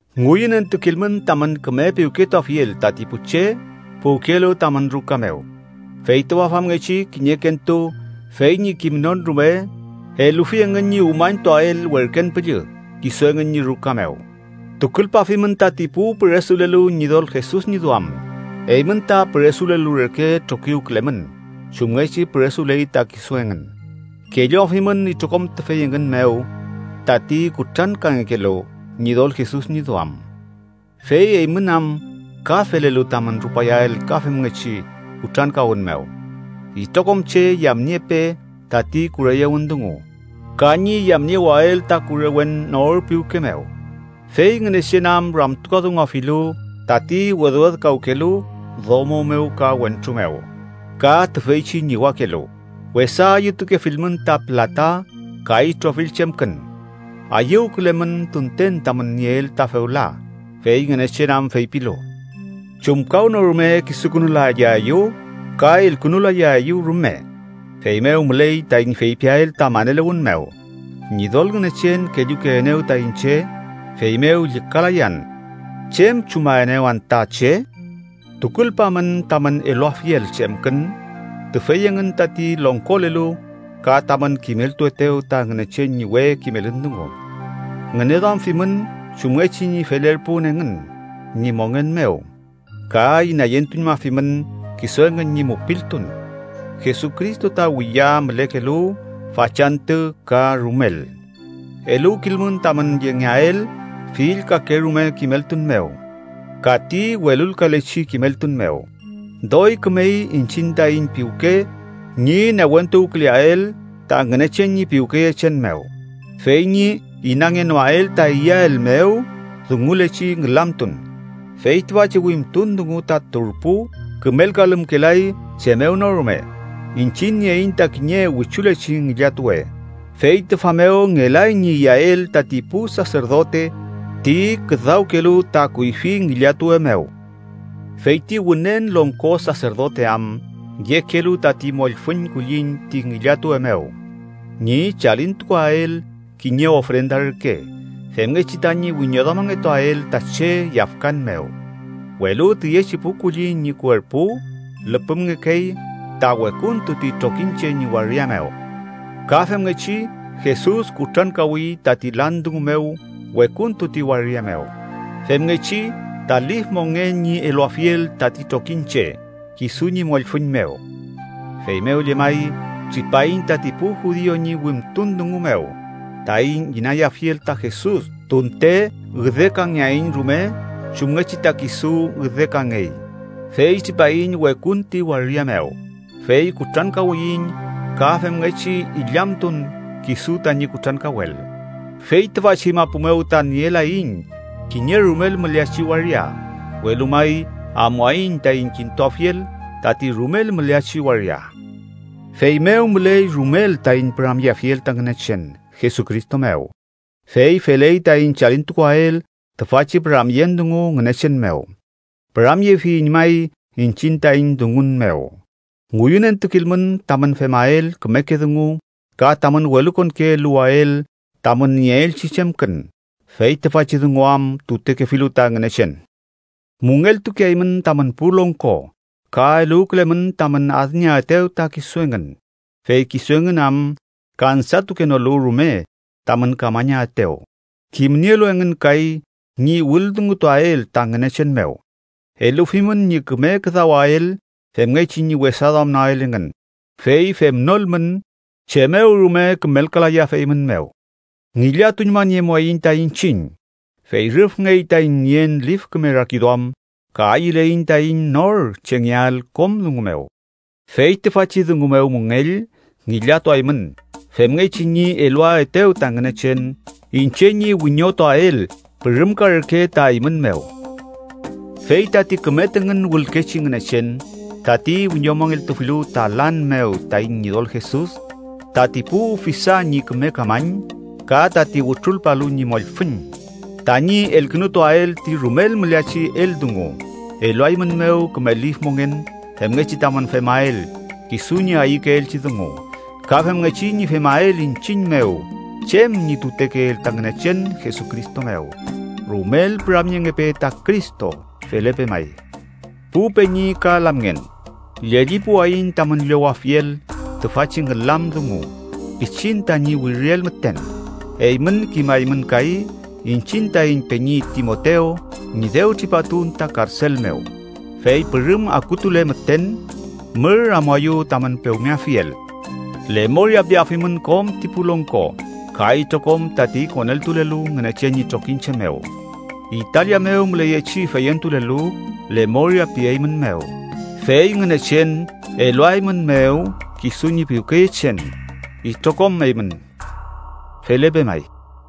Ngüyünentukilmün tamün küme piwketuafiel tati pu che puwkelu tamün ruka mew, fey tüfa famngechi kiñekentu fey ñi kimnon rume elufi engün ñi umañtuael werken püllü kisu engün ñi ruka mew. Tukulpafimün tati pu püresulelu Ñidol Jesus ñi duam. Eymün ta püresulelu reke trokiwkülemün chumngechi püresuley ta kisu engün. Kelluafimün itrokom tüfey engün mew tati kutrankangekelu Ñidol Jesus ñi duam, fey eymün am ka felelu tamün rupayael ka femngechi kutrankawün mew. Itrokom che yamniepe tati kureyewün dungu ka ñi yamniewael ta kurewen nor piwke mew, fey Ngünechen am ramtukadunguafilu tati wedwedkawkelu domo mew ka wentru mew, ka tüfeychi ñiwakelu. Wesa ayütukefilmün ta pülata ka itrofill chemkün. Ayüwkülemün tunten tamün nieel ta fewla, fey Ngünechen am feypilu: “Chumkawnorume kisukünulayaeyu ka elkünulayaeyu rume.” Feymew müley taiñ feypiael ta maneluwün mew: “Ñidol Ngünechen kellukeenew ta iñche, feymew llükalayan. ¿Chem chumaenew anta che?” Tukulpamün tamün eluafiel chemkün tüfey engün tati longkolelu ka tamün kimeltuetew ta Ngünechen ñi we kimelün dungu. Ngüneduamfimün chumngechi ñi felerpun engün ñi mongen mew ka inayentuñmafimün kisu engün ñi mupiltun. Jesucristo ta wiya mülekelu, fachantü ka rumel. Eluwkilmün tamün yengeael fill kakerume kimeltun mew ka ti welulkalechi kimeltun mew. Doy kümey iñchiñ taiñ piwke ñi newentuwküleael ta Ngünechen ñi piwkeyechen mew, fey ñi inangenoael ta iyael mew dungulechi ngülamtun. Fey tüfachi wimtun dungu ta turpu kümelkalümkelay chem mew no rume. Iñchiñ nieiñ ta kiñe wichulechi ngillatuwe, fey tüfa mew ngelay ñi iyael tati pu saserdote ti küdawkelu ta kuyfi ngillatuwe mew. Fey ti Wünen Longko Saserdote am yekelu tati mollfüñ kulliñ ti ngillatuwe mew, ñi chalintukuael kiñe ofrenda reke femngechi tañi wiñoduamangetuael ta che yafkan mew, welu tüyechi pu kulliñ ñi kuerpu lüpümngekey ta wekuntu ti trokiñche ñi waria mew. Ka femngechi, Jesus kutrankawi tati lan dungu mew wekuntu ti waria mew, femngechi ta lif mongen ñi eluafiel tati trokiñche kisu ñi mollfüñ mew. Feymew llemay tripaiñ tati pu judiu ñi wimtun dungu mew taiñ inayafiel ta Jesus tunte üdekangeaiñ rume chumngechi ta kisu üdekangey fey tripaiñ wekun ti waria mew, fey kutrankawiyiñ ka femngechi illamtun kisu tañi kutrankawel. Fey tüfachi mapu mew ta nielaiñ kiñe rumel müleachi waria, welu may amuaiñ taiñ kintuafiel tati rumel müleachi waria. Feymew müley rumel taiñ püramyeafiel ta Ngünechen Jesucristo mew. Fey feley taiñ chalintukuael tüfachi püramyen dungu Ngünechen mew. ¡Püramyefiyiñ may iñchiñ taiñ dungun mew! Ngüyünentukilmün tamün femael kümeke dungu ka tamün welukonke eluwael tamün nieelchi chemkün, fey tüfachi dungu am tutekefilu ta Ngünechen. Müngeltukeaymün tamün pu longko ka eluwkülemün tamün adnieaetew ta kisu engün, fey kisu engün am kansatukenolu rume tamün kamañaetew, kimnielu engün kay ñi wüldungutuael ta Ngünechen mew. Elufimün ñi küme küdawael femngechi ñi wesaduamnoael engün, fey femnolmün chem mew rume kümelkalayafeymünmew. Ngillatuñmaniemuaiñ ta iñchiñ. Fey rüfngey taiñ nien lif küme rakiduam, ka ayüleiñ taiñ nor chengeael kom dungu mew. Fey tüfachi dungu mew müngell ngillatuaymün femngechi ñi eluaetew ta Ngünechen iñche ñi wiñotuael pürümka reke ta eymün mew. Fey tati küme tüngün wülkechi Ngünechen, tati wiñomongeltufilu ta lan mew taiñ Ñidol Jesus, tati pu ufisa ñi küme kamañ, ka tati wütrulpalu ñi mollfüñ tañi elkünutuael ti rumel müleachi eldungu, eluaeymünmew küme lif mongen femngechi tamün femael kisu ñi ayükeelchi dungu. Ka femngechi ñi femael iñchiñ mew chem ñi tutekeel ta Ngünechen Jesucristo mew. ¡Rumel püramyengepe ta Cristo! Felepe may. Pu peñi ka lamngen, llellipuwayiñ tamün llowafiel tüfachi ngülam dungu pichin tañi wiriel müten. Eymün kimaymün kay iñchiñ taiñ peñi Timotew ñi dew tripatun ta karsel mew. Fey pürüm akutule müten, mür amuayu tamün pewmeafiel. Lemoria piafimün kom ti pu longko ka itrokom tati koneltulelu Ngünechen ñi trokiñche mew. Italia mew müleyechi feyentulelu lemoria pieymünmew. Fey Ngünechen eluaeymünmew kisu ñi piwkeyechen itrokom eymün. Felepe may.